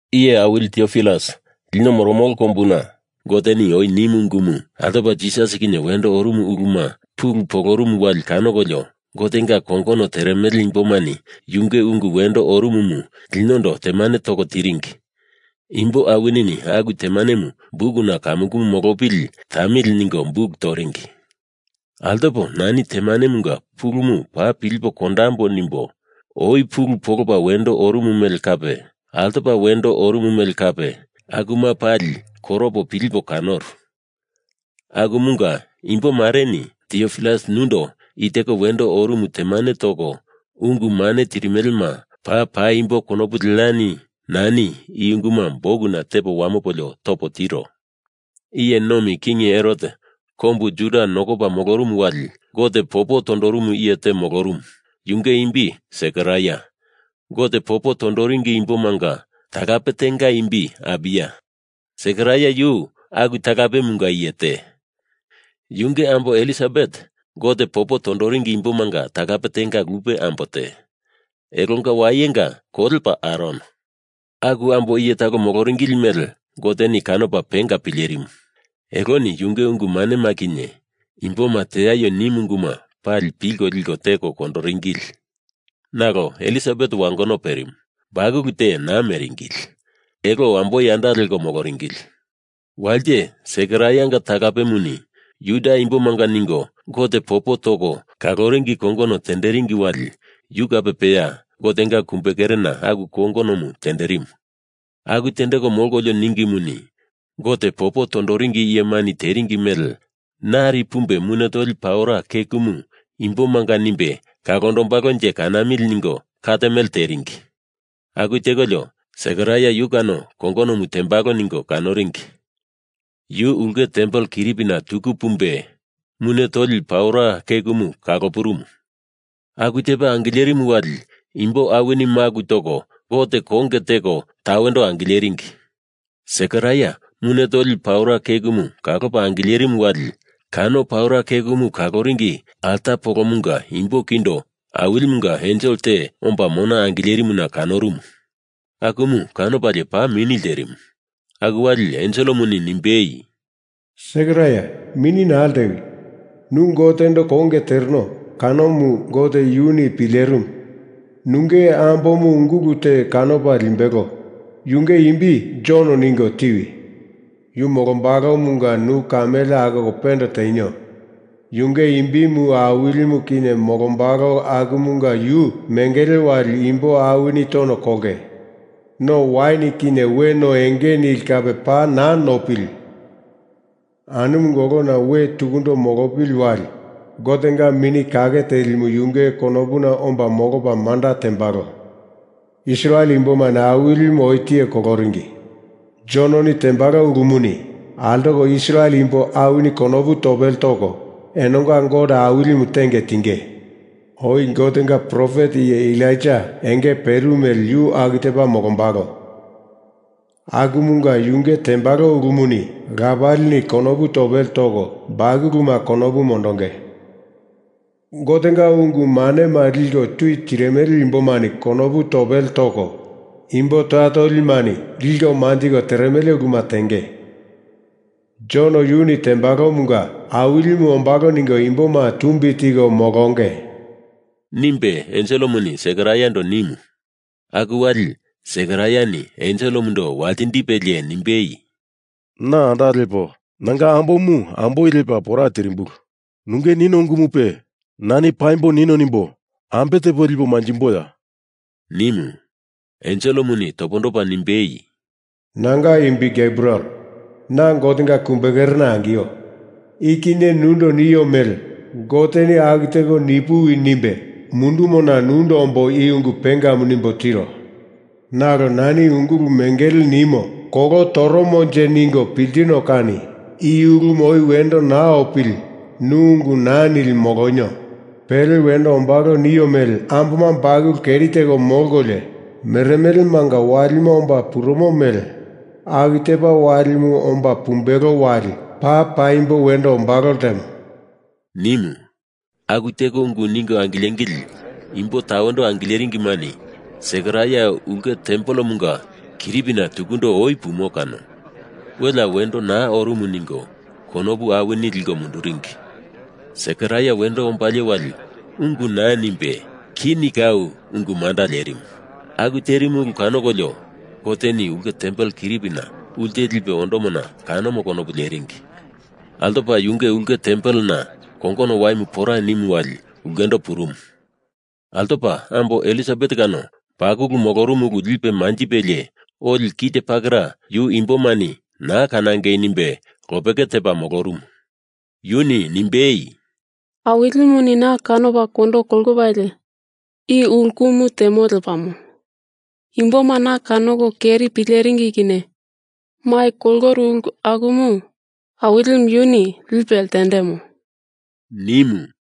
Iye Awili Tiopilus, lino moromolo kombuna Goteni oi nimu ungumu altopa Jisas kinye wendo orumu uluma pulu polorumu wali kanokolio, Gotenga kongono teremele imbomani yunge ungu wendo orumumu linondo temane toko tiringi. Imbo awinini aku temanemu bukuna kamukumu molopili tamili ningo buk toringi. Altopo nani temanemunga pulumu paa pilipo kondambo nimbo oi pulu polopa wendo orumu mele kape altopa wendo orumu mele kape akuma pali koropo pilipo kanoru. Akumunga imbo mareni Tiopilus nundo i teko wendo orumu temane toko ungu mane tirimelema paa paimbo konopu leani nani i unguma bukuna tepo wamopolio topo tiro. Iye Nomi King Herot kombu Juda nokopa molorumu wali Gote popo tondorumu iye te molorumu, yunge imbi Sekaraia. Gote popo tondoringi imbomanga talape tenga imbi Abiya, Sekaraia yu aku talapemunga iye te. Yunge ambo Ilisabet Gote popo tondoringi imbomanga talape tenga lupe ambo te. Elonga wayenga kolepa Aron. Aku ambo iye talo moloringili mele Goteni kanopa penga pilerimu. Eloni yunge ungu manema kinye Imboma teaio nimu unguma pali pilko liko teko kondoringili. Nalo Ilisabet wangono perimu, bakulu te naa meringili. Elo amboi anda leko moloringili. Walite Sekaraianga talapemuni Juda Imbomanga ningo Gote popo toko kaloringi kongono tenderingi wali yu kape peya Gotenga kumbe kerena aku kongonomu tenderimu. Aku tendeko molkolio ningimuni, Gote popo tondoringi iyemani teringi mele nari pumbe mune toli paura kekumu imbomanga nimbe kalondombalonje kanamili ningo kat mele teringi. Aku tekolio Sekaraia yu kano kongonomu tendembalo ningo kanoringi. Yu ulke tempel kiripina tuku pumbe mune toli paura kekumu kalopurumu. Aku tepa angilerimu wali imbo awini maku toko Gote konge teko tawendo angileringi. Sekaraia mune toli paura kekumu kalopa angilerimu wali kano paura kekumu kaloringi alta polomunga imbo kindo Awilimunga ensel te omba mona angilerimuna kanorumu. Akumu kanopalie paa mini lterimu. Aku wali enselemuni nimbei, “Sekaraia, mini naa ltewi. Nu Gotendo konge tereno kanomu Gote yuni pilerimu. Nunge ambomu ungulu te kanopa limbelo. Yunge imbi Jon ningo tiwi! Yu molombalomunga nu kamele akoko pende tenio. Yunge imbimu Awilimu kinye molombalo akumunga yu mengele wali imbo awini tono kolonge. No wain kinye we no enge nili kape paa naa nopili! Anumunga olona we tukundo molopili wali Gotenga Mini Kake Telimu yunge konopuna omba molopa manda tembalo. Israel Imbomani Awilimu oi tiye koloringi Jononi tembalo ulumuni altoko Israel imbo awini konopu topele toko enonga Gote Awilimu tenge tinge. Oi Gotenga profet iye Elaija enge perimu mele yu aku tepa molombalo. Akumunga yunge tembalo ulumuni lapalini konopu topele toko, bakuluma konopu mondonge. Gotenga ungu manema liko tui tirimele imbomani konopu topele toko, imbo toya tolimani liko manjiko teremele uluma tenge. Jon yuni tembalomunga Awilimu ombalo ningo imboma tumbi tiko molonge,” nimbe enselemuni Sekaraiando nimu. Aku wali Sekaraiani enselemundo waltindipelie nimbei, “Na anda lepo nanga ambomu amboi lepa pora tirimbulu. Nunge nino ungumupe nani paimbo nino nimbo ambe tepo lipo manjimboya?” nimu. Enselemuni topondopa nimbei, “Nanga imbi Gebriel. Na Gotenga kumbekerena angio. I kinye nundo nio mele Goteni aku teko nipuwi nimbe mundumona nundo ombo i ungu pengamu nimbo tiro. Nalo nani ungulu mengele nimo kolo toromonje ningo piltino kani i ulumu oi wendo naa opili nu ungu naa nili molonio. Pele wendo ombalo nio mele amboma bakulu keri teko molkolio meremelemanga walima omba purumo mele aku tepa walimu omba pumbelo wali paa paimbo wendo ombalo ltemo,” nimu. Aku teko ungu ningo angilengili imbo tawendo angileringimani Sekaraia ulke tempelemunga kiripina tukundo oi pumo kano, welea wendo naa orumu ningo konopu awini liko munduringi. Sekaraia wendo ombalie wali ungu naa nimbe kini kau ungu manda lerimu. Aku terimu ulu kanokolio Goteni ulke tempel kiripina ulte lipe ondomona kanomo konopu leringi. Altopa yunge ulke tempelena kongono waimu pora nimu wali ulkendo purumu. Altopa ambo Ilisabet kano bakulu molorumu ulu lipe manjipelie oli kite pakera yu Imbomani naa kanangei nimbe lopeke tepa molorumu. Yuni nimbei, “Awilimuni na kanopa kondo kolopalie i ulumu temo lepamo. Imboma na kanoko keri pileringi kinye mai koloru ulu akumu Awilimu yuni lipe ltendemo,” nimu.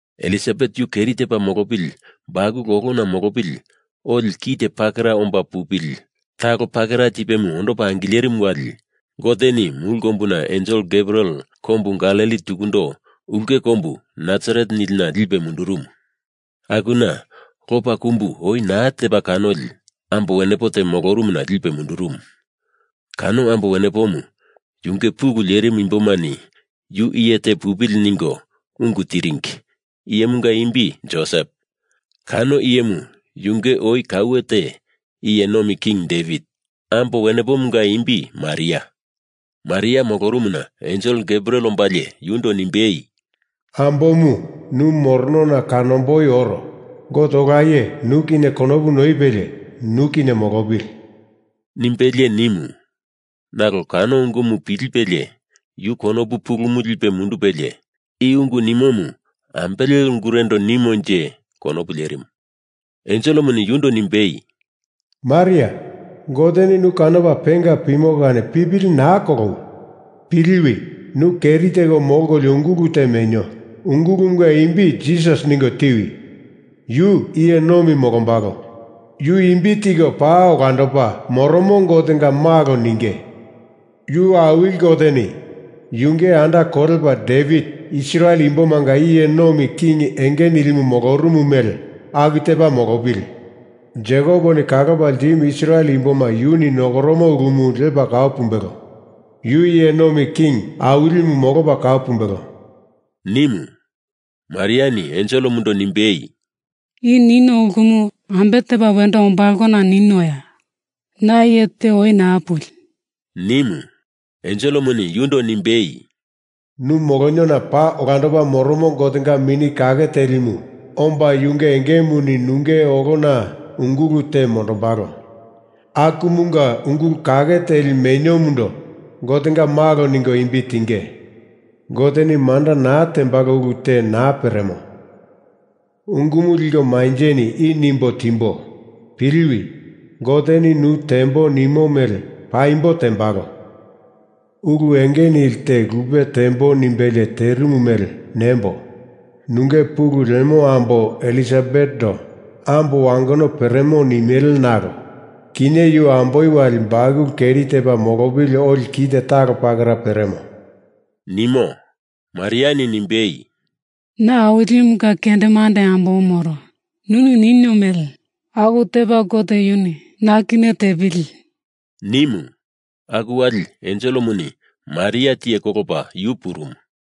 Ilisabet yu keri tepa molopili bakulu olona mondopili oli kite pakera omba pupili talo pakera tipemu ondopa angilerimu wali Goteni mulu kombuna ensel Gebriel kombu Galili tukundo ulke kombu Nasaret nilina lipe mundurumu. Akuna lopa kumbu oi naa tepa kanoli ambo wenepo te molorumuna lipe mundurumu. Kano ambo wenepomu yunge pulu lerimu imbomani yu iye te pupili ningo ungu tiringi, iyemunga imbi Josep. Kano iyemu yunge oi kaue te Iye Nomi King Devit. Ambo wenepomunga imbi Maria. Maria molorumuna Ensel Gebriel ombalie yundo nimbei, “Ambomu, nu moronona kanomboi oro. Gote Ola Iye nu kinye konopu noipelie, nu kinye molopili,” nimbelie nimu. Nalo kano ungumu pilipelie yu konopu pulumu lipe mundupelie i ungu nimomu ambele ungurendo nimonje konopu lerimu. Enselemuni yundo nimbei, “Maria, Goteni nu kanopa penga pimo kani pipili naa kolowi! Piliwi, nu keri teko molkolio ungulu te menio. Ungulumunga imbi Jisas ningo tiwi! Yu iye nomi molombalo. Yu imbi tiko Paa Olandopa Moromo Gotenga Malo ninge. Yu Awili Goteni Yunge anda kolepa Devit Israel imbomanga iye nomi king enge nilimu molorumu mele aku tepa molopili. Jekoponi kalopa ltimu Israel imboma yuni nokoromo ulumu lepa kau pumbelo. Yu iye nomi king awilimu molopa kau pumbelo,” nimu. Mariani enselemundo nimbei, “I nino ulumu ambe tepa wendo ombalona ninoya? Na iye te oi naa puli,” nimu. Enselemuni yundo nimbei, “Nu moloniona Paa Olandopa Moromo Gotenga Mini Kake Telimu omba yunge engemuni nunge olona ungulu te mondombalo. Akumunga ungulu kake teli meniomundo Gotenga Malo ningo imbi tinge. Goteni manda naa tembalo ulu te naa peremo ungumu liko manjeni i nimbo timboi. Piliwi. Goteni nu tembo nimo mele paimbo tembalo. Ulu enge nili te lupe tembo nimbelie terimu mele nembo nunge pulu lemo ambo Ilisabetendo ambo wangono peremo nimele nalo kinye yu amboi wali bakulu keri tepa molopili oli kite talo pakera peremo,” nimo. Mariani nimbei, “Na Awilimunga kendemande ambomu moro. Nuni nino mele aku tepa Gote yuni na kinye tepili,” nimu. Aku wali enselemuni Maria tiye kolopa yu purumu.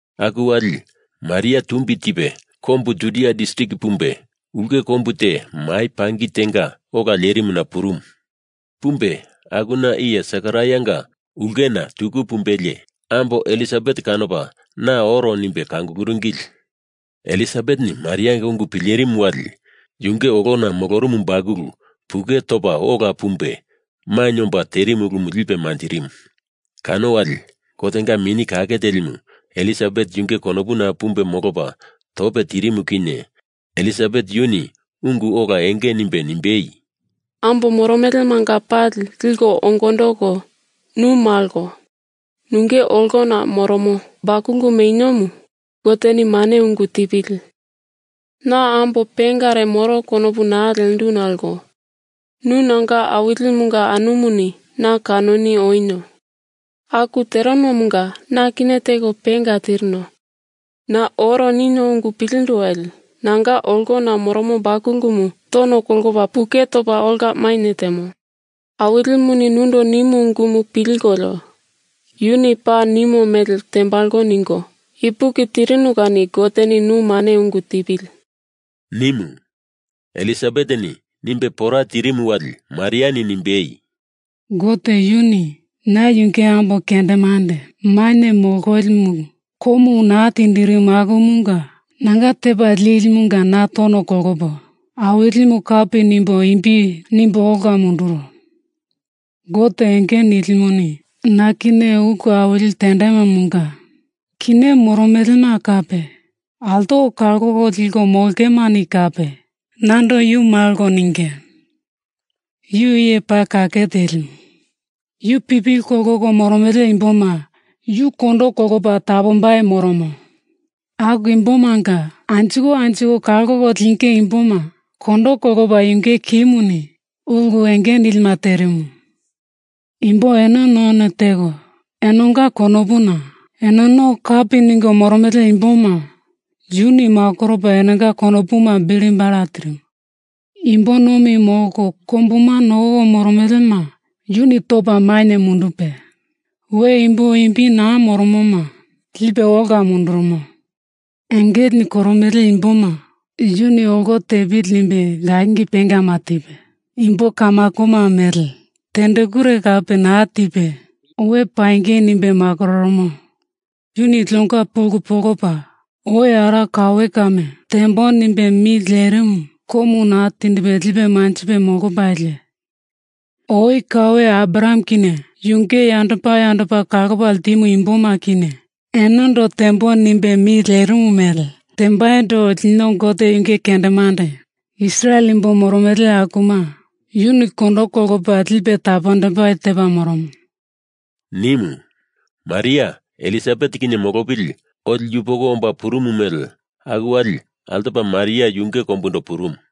Aku wali Maria tumbi tipe kombu Judia distrik pumbe ulke kombu te mai pangi tenga ola lerimuna purumu. Pumbe akuna iye Sekaraianga ulkena tuku pumbelie ambo Ilisabet kanopa na oro nimbe kanguluringili. Ilisabeteni Marianga ungu pilerimu wali yunge olona molorumu bakulu puke topa ola pumbe mainye omba terimu ulumu lipe manjirimu. Kano wali Gotenga Mini Kake Telimu Ilisabet yunge konopuna pumbe molopa tope tirimu kinye Ilisabet yuni ungu ola enge nimbe nimbei, “Ambo moromelemanga pali liko ongondoko, nu malo. Nunge olona moromo bakulu meniomu Goteni mane ungu tipili. Na ambo pengare moro konopu naa lendu nalo nu nanga awilimunga anumuni na kanoni onio. Aku terenomunga na kinye teko penga tirino. Na oro ninio ungu pilindu wali nanga olona moromo bakulumu tono kolopa puke topa ola mainye temo. Awilimuni nundo nimu ungumu pilkolio Yuni paa nimo mele tembalo ningo ipuki tirinu kani Goteni nu mane ungu tipili,” nimu. Ilisabeteni nimbe pora tirimu wali Mariani nimbe, “Gote yuni na yunge ambo kendemande mainye mololimu komu naa tindirimo akumunga nanga Tepa Lilimunga na tono kolopo Awilimu kapi nimbo imbi nimbo ola munduro! Gote Enge Nilimuni na kinye ulu awili tendemomunga kinye moromelema kape altoko kalko liko molongemani kape nando Yu malo ninge. Yu iye paa kake telimu. Yu pipili kolko moromele imboma yu kondo kolopa tapombai moromo. Aku imbomanga anjiko anjiko kalko linge imboma kondo kolopa yunge kimuni ulu enge nilima terimu. Imbo eno none teko enonga konopuna enono kapi ningo moromele imboma yuni makoropa enonga konopuma bili bala tirimu. Imbo nomi molko kombuma nokoko moromelema yuni topa mainye mundupe, we imbo imbi naa moromoma lipe ola mundurumo. Engelena koromele imboma yuni olo tepili nimbe langi pengama tipe, imbo kamakoma mele tendekure kape naa tipe we pangei nimbe makororomo. Yuni linonga pulu polopa oi ara kaue kame tembo nimbe mi lerimumu komu naa tindipe lipe manjipe molopalie, oi kaue Abraham kinye yunge yandopa yandopa kalopa ltimu imboma kinye enondo tembo nimbe mi lerimu mele tembaindo lino Gote yunge kendemande Israel imbo moromolo akuma yuni kondo kolopa lipe tapondombai tepa moromo,” nimu. Maria Ilisabet kinye molopili oli yupoko omba purumu mele aku wali altopa Maria yunge kombundo purumu.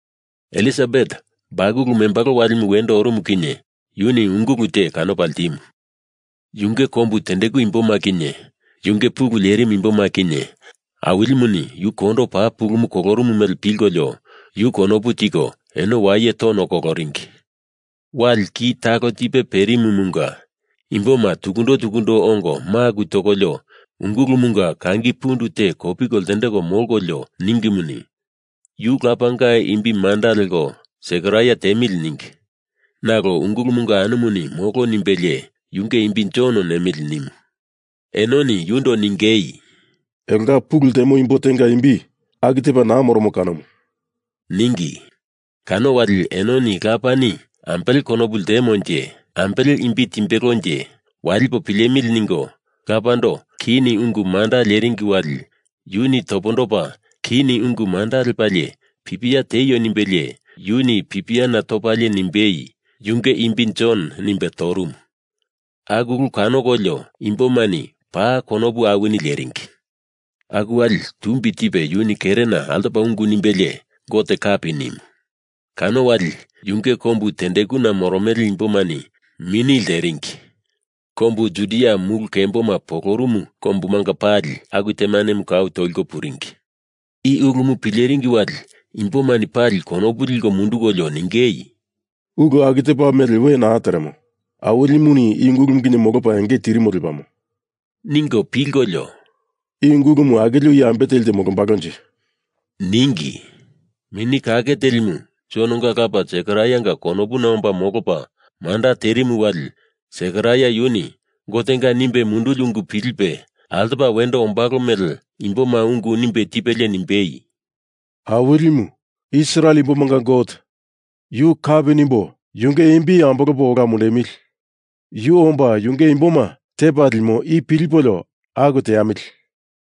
Ilisabet bakulu membalo walimu wendo orumu kinye yuni ungulu te kanopa ltimu. Yunge kombu tendeku imboma kinye yunge pulu lerimu imboma kinye Awilimuni yu kondo paa pulumu kolorumu mele pilkolio yu konopu tiko eno waye tono koloringi. Wali ki talo tipe perimumunga imboma tukundo tukundo ongo maku tokolio ungulumunga kangi pundu te kopiko ltendeko molkolio ningimuni, yu lapanga imbi manda leko Sekaraia tiemili ningi. Nalo ungulumunga anumuni molo nimbelie yunge imbi Jon nemili nimu. Enoni yundo ningei, “Elonga pulu ltemo imbo tenga imbi aku tepa naa moromo kanomu,” ningi. Kano wali enoni Lapani ambele konopu ltemonje, ambele imbi timbelonje, walipo pilemili ningo lapando kini ungu manda leringi wali yuni topondopa kini ungu manda lepalie pipia tieio nimbelie, yuni pipiana topalie nimbei, “Yunge imbi Jon,” nimbe torumu. Aku ulu kanokolio imbomani paa konopu awini leringi. Aku wali tumbi tipe yuni kerena altopa ungu nimbelie Gote kapi nimu. Kano wali yunge kombu tendekuna moromele imbomani mini leringi. Kombu Judia mulu kemboma polorumu kombumanga pali aku temanemu kau toliko puringi. I ulumu pileringi wali imbomani pali konopu liko mundukolio ningei, “Ulu aku tepa mele we naa teremo. Awilimuni i ungulumu kinye molopa enge tirimo lepamo,” ningo pilkolio “I ungulumu akilio iye ambe teli te molombalonje?” ningi. Mini Kake Telimu Jononga lapa Sekaraianga konopuna omba molopa manda terimu wali Sekaraia yuni Gotenga nimbe munduli ungu pilipe, altopa wendo ombalo mele imboma ungu nimbe tipelie nimbei, “Awilimu, Israel imbomanga Gote, yu kapi nimbo yunge imbi ambolopa ola mundemili! Yu omba yunge imboma tepa limo i pilipolio aku teamili!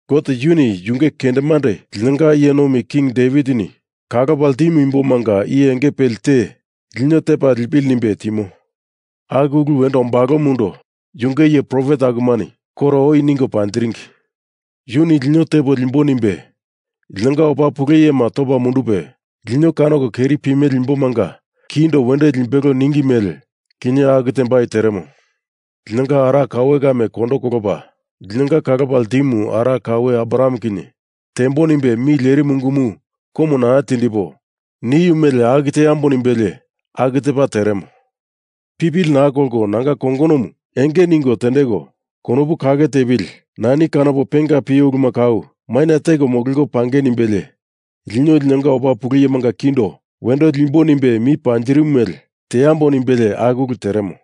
Gote yuni yunge kendemande linonga Iye Nomi King Devitini kalopa ltimu imbomanga iye enge peli te lino tepa lipili nimbe timo. Aku ulu wendo ombalomundo yunge iye profet akumani koro oi ningo panjiringi. Yuni lino tepo liembo nimbe linonga opa pulu iyema topa mundupe, lino kanoko keri pimele imbomanga kindo wendo limbelo ningi mele, kinye aku tembai teremo. Linonga ara kaue kame kondo kolopa, linonga kalopa ltimu ara kaue Abraham kinye tembo nimbe mi lerimu ungumu komu naa tindipo, niu mele aku teambo nimbelie aku tepa teremo. Pipili naa kolko nanga kongonomu enge ningo tendeko, konopu kake tepili nani kanopo penga pio uluma kau maina teko mololiko pangei nimbelie lino linonga opa pulu iyemanga kindo wendo limbo nimbe mi panjirimu mele teambo nimbelie aku ulu teremo.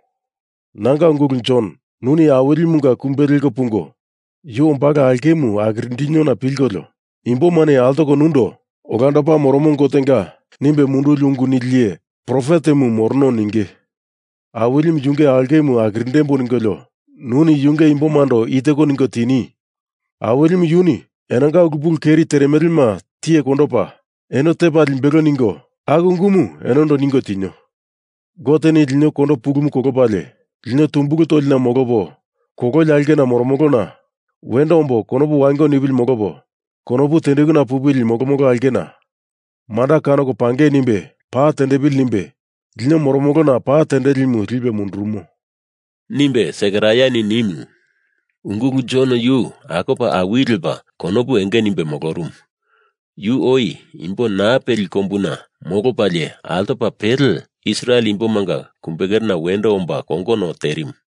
Nanga ungulu Jon, nuni Awilimunga kumbe leko pungo yu ombalo aulkemu akirindiniona pilkolio, imbomani altoko nundo Olandopa Moromo Gotenga nimbe munduli ungu nili iye profetemu morono ninge. Awilimu yunge aulkemu akirindembo ningolio nuni yunge imbomando i teko ningo tini: Awilimu yuni enonga ulu pulu keri teremelema tiye kondopa eno tepa limbelo ningo, aku ungumu enondo ningo tinio. Goteni lino kondo pulumu kolopalie lino tumbulu tolina molopo kololi aulkena moromolona wendo ombo konopu wango nipili molopo konopu tendekuna pupili molomolo aulkena manda kanoko pangei nimbe pa tendepili nimbe lino moromolona pa tendelimu lipe mundurumo,” nimbe Sekaraiani nimu. Ungulu Jon yu akopa awili lepa konopu enge nimbe molorumu. Yu oi imbo naa peli kombuna molopalie altopa pele Israel imbomanga kumbekerena wendo omba kongono terimu.